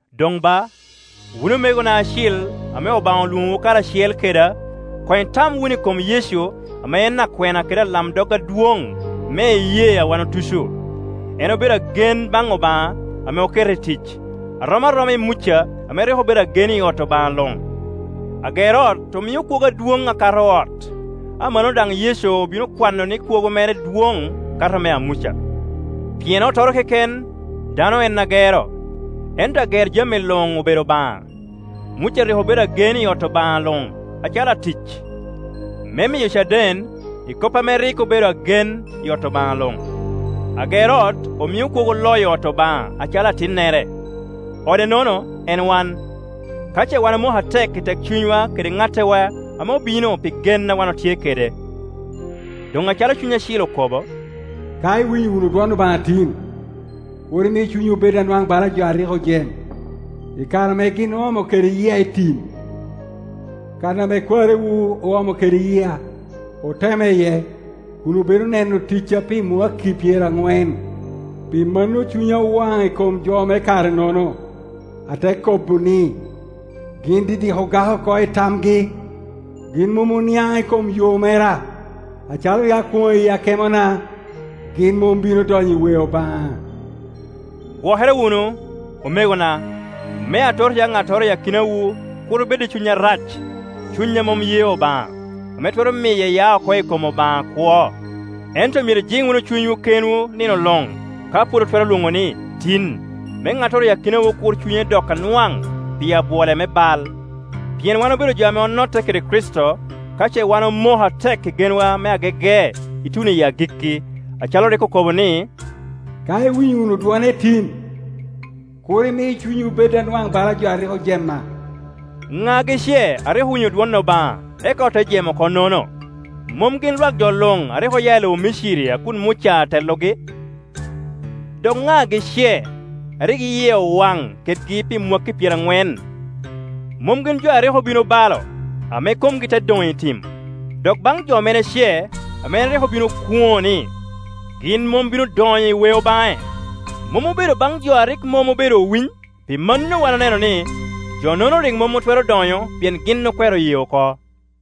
Doŋ ba, wun omegona acil ame Obaŋa olwoŋowu karacel keda, doŋ itam wunu i kom Yecu ame en akwena kede alamdog adwoŋ me iyee a wan otuco. En obedo agen baŋ Obaŋa ame okete i tic, a rom aroma i Muca ame rik obedo agen i ot Obaŋa luŋ. Ager ot omio kwogo adwoŋ akato ot; amannono daŋ Yecu obin okwano ni kwogo mere dwoŋ kato mea Muca. Pien ottoro keken, dano en agero, ento ager jami luŋ obedo Obaŋa. Muca rik obedo agen i ot Obaŋa luŋ acalo atic, me miyo caden i kop ame rik obedo agen i ot Obaŋa luŋ. Ager ot omio kwogo loyo ot Obaŋa acalo atinnere. Ode-nono en wan, ka ce wan omoko atek i tekcunywa kede ŋatetwa ame obino pi gen a wan otye kede. Doŋ acalo Cuny Acil okobo, “Ka iwinyo wunu dwon Obaŋa tin, kur imi cunywu bed anwaŋ bala jo a rik ojem, i kare ame gin oomo kede yia i tim, kan ame kwariwu oomo kede yia, otema iye, kun obedo neno ticca pi mwakki pyeraŋwen, Pi mano cunya owaŋ i kom jo me kare-nono, ate kobo ni, ‘Gin didik ogak oko i tamgi; gin mom oniaŋ i kom yo mera.’ Acalo rik akwoŋo i akemona, ‘Gin mom bino donyo i weo baŋa.’” Gwokere wunu, omegona, me atot ya ŋattoro i akinawu kur bed i cuny arac, cunya mom ye Obaŋa, ame twero miye ya oko i kom Obaŋa akwo. Ento myero ijiŋ wunu cunywu kenwu nino luŋ ka pwod otwero lwoŋo ni, “tin”, me ŋattoro i akinawu kur cunye dok anwaŋ pi abwole me bal. Pien wan obedo jo ame onotte kede Kricito, ka ce wan omoko atek i genwa me agege ituno i agikki, acalo rik okobo ni, “Ka iwinyo wunu dwone tin, kur imi cunywu bed anwaŋ balajo a rik ojema.” Ŋagi ce a rik owinyo dwon Obaŋa, eka ote jem oko-nono? Mom gin lwak jo luŋ a rik oya i lobo Miciri a kun Muca atelogi? Dok ŋagi ce a rik yie owaŋ kedgi pi mwakki pyeraŋwen? Mom gin jo a rik obin obalo, ame komgi te doŋ i tim? Dok baŋ jo mene ce ame en rik obin okwoŋo ni, gin mom bino donyo i weo baŋe? Mom obedo baŋ jo a rik mom obedo owiny? Pi mano wan oneno ni, jo-nono rik mom otwero donyo pien gin okwero ye oko.